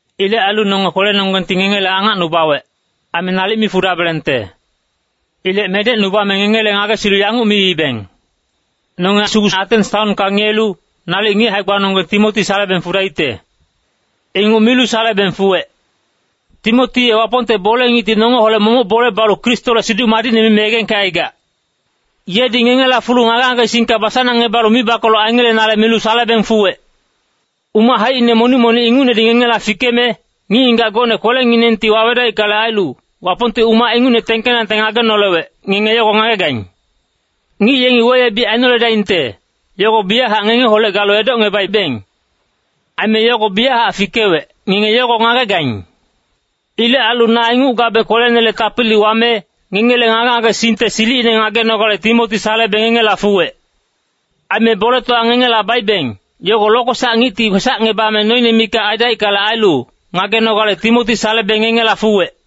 Ilec ailu nonge kwelenonggengti ngengele angacnubawec, aime nalic mi fudabelengte. Ilec medecnubame ngengele ngagesilu yanguc miibeng, “Nonge sugu Atens taonka ngiyelu, nalic ngic hae-gbanonggeng Timoti salebeng fudaicte.” Inguc milu salebeng fuwec. Timoti ye Wapongte bole-ngicti nongeholec momoc bole balu Kristole Siduc Madicne mime yegengkecaigac. Yedi ngengela fulu ngage-ngagesingka basanangngebalu mibakoloc aingelenale milu salebeng fuwec. Umac haicine monic-monic ingucnedi ngengela fikeme, ngic-ngigac gocne kwelenginengti wawedaickale ailu, Wapongti umac ingucne tengkenangte ngagenolewec, ngenge yogo ngagegaing. Ngic yengi weyebic ainoledaingte, yogo biyachac ngengeholec galu edocngebaibeng. Aime yogo biyachac fikewec, ngenge yogo ngagegaing. Ilec ailu na inguc gabe kwelenele tapili wame, ngengele ngage-ngagesingte silicine ngagenogale Timoti salebe ngengela fuwec. Aime boletowa ngengela baibeng, yogo Lokwesac Ngicti kwesacngebame noine mikac aidaickale ailu, ngagenogale Timoti salebe ngengela fuwec.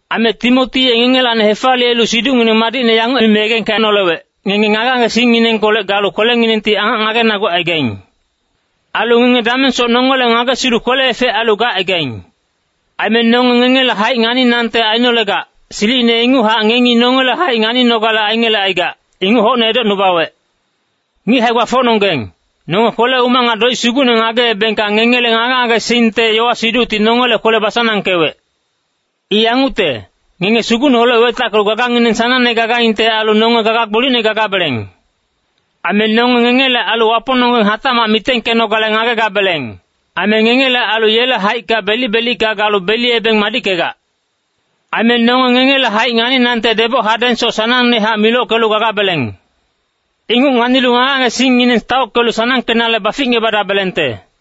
Aime Timoti ye ngengelacni hefaliyelu siducngineng madicne yanguc mime yegengkenolewec, ngenge ngage-ngagesingkolec galu kwelenginengti angac ngagenagucaigaing. Ailu ngenge damengsoc nongele ngagesilu kwele-efec ailu gacaigaing. Aime nonge ngengele haic nganinangte ainolegac, silicine ingucnehac ngengi nongele haic nganinogale aingelecaigac, inguc hocne edocnubawec. Ngic hae-gbafocnonggeng, nonge kwele-umac nga doic sugucne ngageebengka ngengele ngage-ngagesingte yowa-siducti nongele kwele basanangkewec. I yangucte, ngenge Sugucneholec wetackelu gagangineng sanangne gagaingte ailu nonge gaga gbolicne gagabeleng. Aime nonge ngengele ailu Wapongnonggeng hatacmac mitengkenogale ngagegabeleng. Aime ngengele ailu yele haicka belic-belicka galu beliyebeng madickegac. Aime nonge ngengele haic nganinangte deboc hadengsoc sanangnehac milockelu gagabeleng. Inguc nganilu ngage-ngagesingngineng taockelu sanangkenale baficngebadabelengte.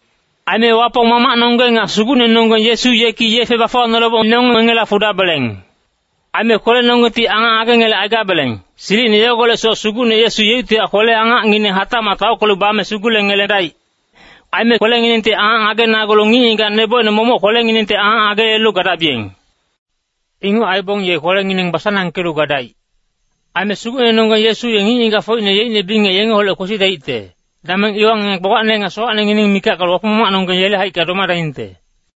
Aime Wapong Mamacnonggeng nga Sugucnenonggeng Yesu yeki yefe bafuwanoleboc nonge ngengela fudabeleng. Aime kwelenonggengti angac ngagengelecaigabeleng, silicine yogolecsoc Sugucne Yesu yeuctihac kwele-angacngineng hatacmac taockelu bame sugulengeledaic. Aime kwelenginengti angac ngagenagulu ngic-ngigac nebocine momoc kwelenginengti angac ngageyelelu gadabiyeng. Inguc aibong ye kwelengineng basanangkelu gadaic. Aime Sugucnenonggeng Yesu ye ngic-ngigacfocine yeicne bingec yengeholec kwesidaicte, dameng iwa ngenge gbagbacne nga sowacnengineng mikac galu Wapong Mamacnonggeng yele haicka domadaingte.